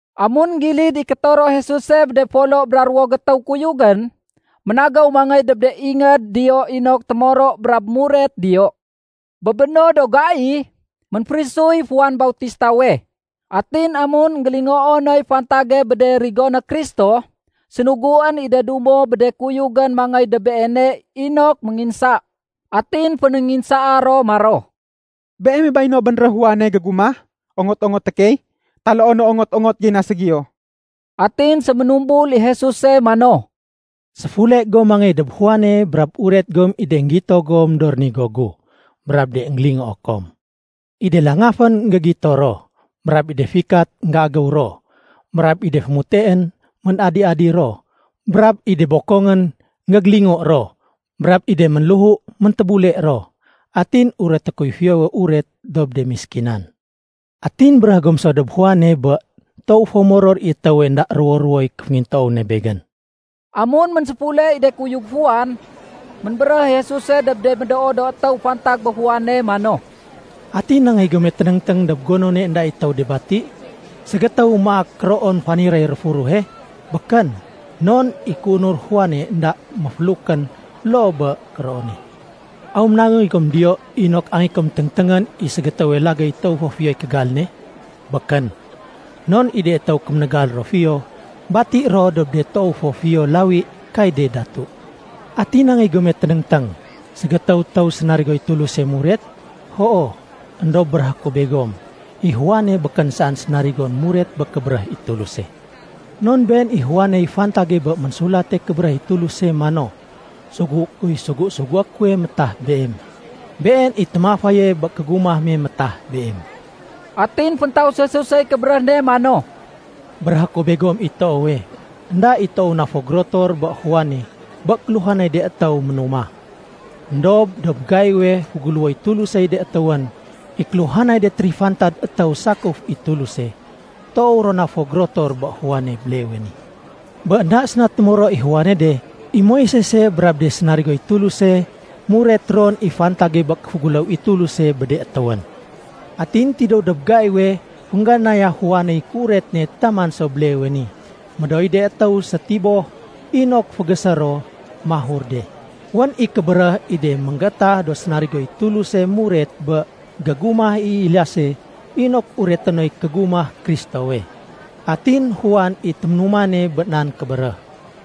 Amun énggilid i kétoro Jesuse bé de folo bra ruwo gétéw kuyugén, ménagéw mangéy dob de ingéd diyo inok témoro brab muret diyo. Bé béno do gai, ménférisuy Juan Bautistawe. Atin amun énggélingoo noy fantage bé de rigoné Kristo, sénuguén i de dumo bé de kuyugén mangéy dob Beene inok ménginsa. Atin fénénginsaa ro maro, “Beeme bay no bénréh Juane gégumah ongot-ongoté key, taloo no ongot-ongot gey na ségiyo?” Atin séménumbul i Jesuse mano, “Séfule gom mangéy dob Juane brab uret gom i de énggito gom do rénigo gu brab de énggélingoo kom. I de langafén énggégito ro, brab i de fikat énggéagéw ro, brab i de fémuteén ménadi-adi ro, brab i de bokongén énggégélingo ro, brab i de ménléhu méntébule ro. Atin ureté kuy Fiyowe Uret dob de méskinan. Atin béréh gom so dob Juane bé toow fo moror i étéwe énda ruwo-ruwoy kéféngintoow ne Begén.” Amun ménséfule i de kuyug Juan, ménbéréh i Jesuse dob de médoo do étéw fantag bé Juane mano, “Ati nangéy gome ténéngténg dob gonone énda i étéw de bati? Ségétéw maak kéroon faniréy réfurehe? Békén, non i kéunur Juane énda méfélukén loo bé kéroone. Aw ménangéy gom diyo inok angéyé kom téngténgén i ségétéwe lagéy toow fo fiyoy kégal ne? Békén, non i de étéw kémégal ro fiyo bati ro dob de toow fo fiyo lawi kay de datu. Ati nangéy gome ténéngténg? Ségétéw étéw sénarigoy Tuluse muret? Hoo, éndob béréhé ku begom, i Juane békén saén sénarigon muret bé kébéréh i Tuluse. Non been i Juane niy fantage bé Ménsulate Kébéréh i Tuluse mano, ‘Sugué kuy sugu-sugué kuwe métah Beem. Been i témafaye bé kégumah me métah Beem.’” Atin féntaus Jesusey kébéréh ne mano, “Béréhé ku begom i toowe, énda i toow na fo gérotor bé Juane bé kéluhanay de étéw ménumah. Endob dob gaiwe féguléwoy Tulusey de étéwén, i kéluhanay de térifantad étéw sakuf i Tuluse, toow ro na fo gérotor bé Juane béleewe ni. Bé énda séna témoro i Juane de, i Moisese brab de sénarigoy Tuluse nuret ron i fantage bé kéféguléw i Tuluse bé de étéwén. Atin tidéw dob gaiwe féngganaya Juaney kéuret ne taman so béleewe ni, médooy de étéw sétiboh inok fégésé ro mahur de. Wén i kébéréh i de énggétah do sénarigoy Tuluse muret bé gégumah Eliase inok ureté noy kégumah Kristowe. Atin Juan i téménumane bé nan kébéréh.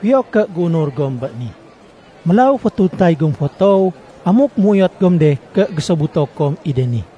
Fiyo ké géunur gom bé ni. Mélaw fétuntay gom fo toow amuk méuyot gom de ké gésobuto kom i de ni.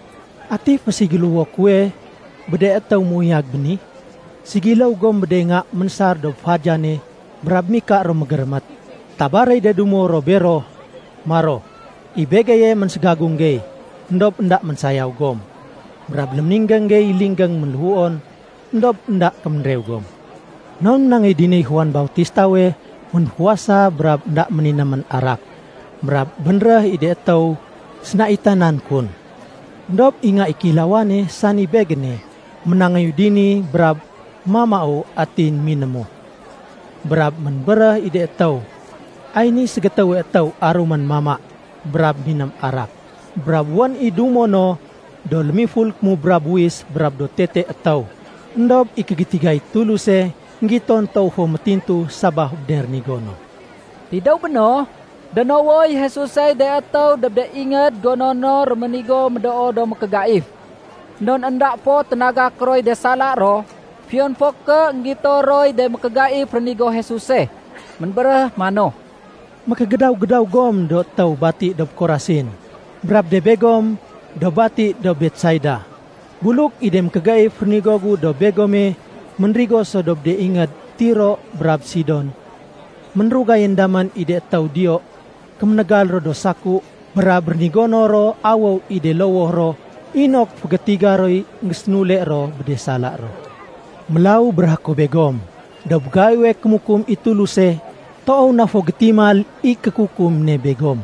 “Ati féségiléwo kuwe bé de étéw méuyag béni? Ségiléw gom bé de nga ménsar dob fadiyane brab mika ro mégérémét. Tabar i de dumo ro bero maro, ‘I begeye ménségagung gey, éndob énda ménsayaw gom. Brab léméninggéng gey linggéng ménléhuon, éndob énda kéménrew gom.’ Non ménangéy diniy Juan Bautistawe ménfuwasa brab énda méninémén arak. Brab bénréh i de étéw sénaitanan kun. Endob i Nga i Kéilawane, sani Begéne, ménangéyu dini, brab mamau atin minému. Brab ménbéréh i de étéw, ‘Ay niy ségétéwe étéw arumén mama brab miném arak, brab wén i dumo no do lémiful kémubra buwis brab do tete étéw.’ Endob i kégétigay Tuluse, énggiton toow fo métintu sabaf bé de rénigo no.” Tidéw béno, dénowoy Jesusey de étéw dob de ingéd gono no réménigo médoo do mékégaif. Non énda fo ténagak roy de sala ro fiyon fo ké énggito roy de mékégaif rénigo Jesuse. Ménbéréh mano, “Mékégédaw-gédaw gom do étéw bati dob Korasin, brab de begom do bati dob Betsaida. Buluk i de mékégaif rénigo gu dob begome ménrigo so dob de ingéd Tiro brab Sidon, ménrugayén damén i de étéw diyo kéménégal do saku brab rénigono ro awéw i de lowoh ro inok fégétiga roy énggésénule ro bé de sala ro. Mélaw béréhé ku begom, dob gaiwe kémukum i Tuluse, toow na fo gétimal i kékukum ne begom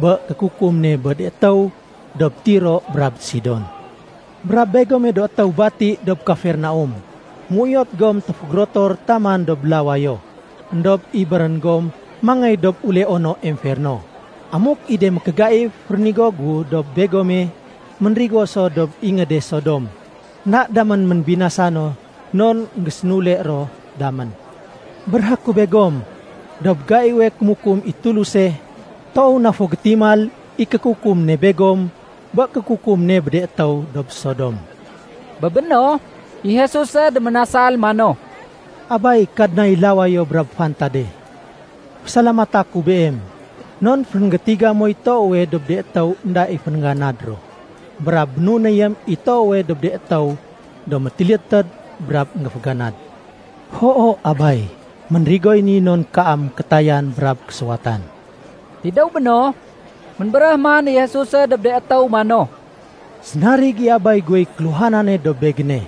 bé kékukum ne bé de étéw dob Tiro brab Sidon. Brab begome do étéw bati dob Kafernaum, méuyot gom téfégérotor taman dob lawayo. Endob ibérén gom mangéy dob uleono emferno. Amuk i de mékégaif rénigo gu dob begome ménrigo so dob ingéde Sodom, énda damén ménbinasa no non énggésénule ro damén. Béréhé ku begom, dob gaiwe kémukum i Tuluse, toow na fo gétimal i kékukum ne begom bé kékukum ne bé de étéw dob Sodom.” Bé béno, i Jesuse déménasal mano, “Abay, Kadnay lawayo brab fantade, fésalamata ku Beem non fénggétiga moy toowe dob de étéw énda i féngganad ro, brab bénunéyém i toowe dob de étéw do métilédtéd brab énggéféganad. Hoo Abay, ménrigoy ni non kaam kétayan brab késuwatan.” Tidéw béno, ménbéréh man i Jesuse dob de étéw mano, “Sénarig i Abay guwey kéluhanane dob Begéne.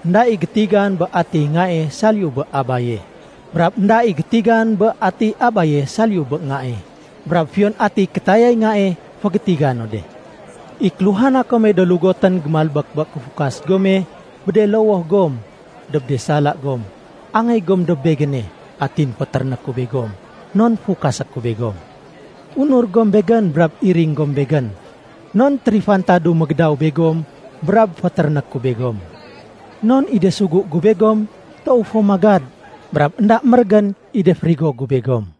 Enda i gétigan bé atiy Ngae saliyu bé Abaye. Brab énda i gétigan bé atiy Abaye saliyu bé Ngae, brab fiyon atiy kétayay Ngae fégétiga no de. “I kéluhana kome do lugotén gémalbék bé kéfukas gome bé de lowoh gom dob de sala gom, angéy gom dob Begéne atin fétéréné ku begom non fukasé ku begom. Unur gom Begén brab iring gom Begén. Non térifantadu mégédaw begom brab fétéréné ku begom. Non i de sugu gu begom toow fo magad, brab énda mérégén i de férigo gu begom.”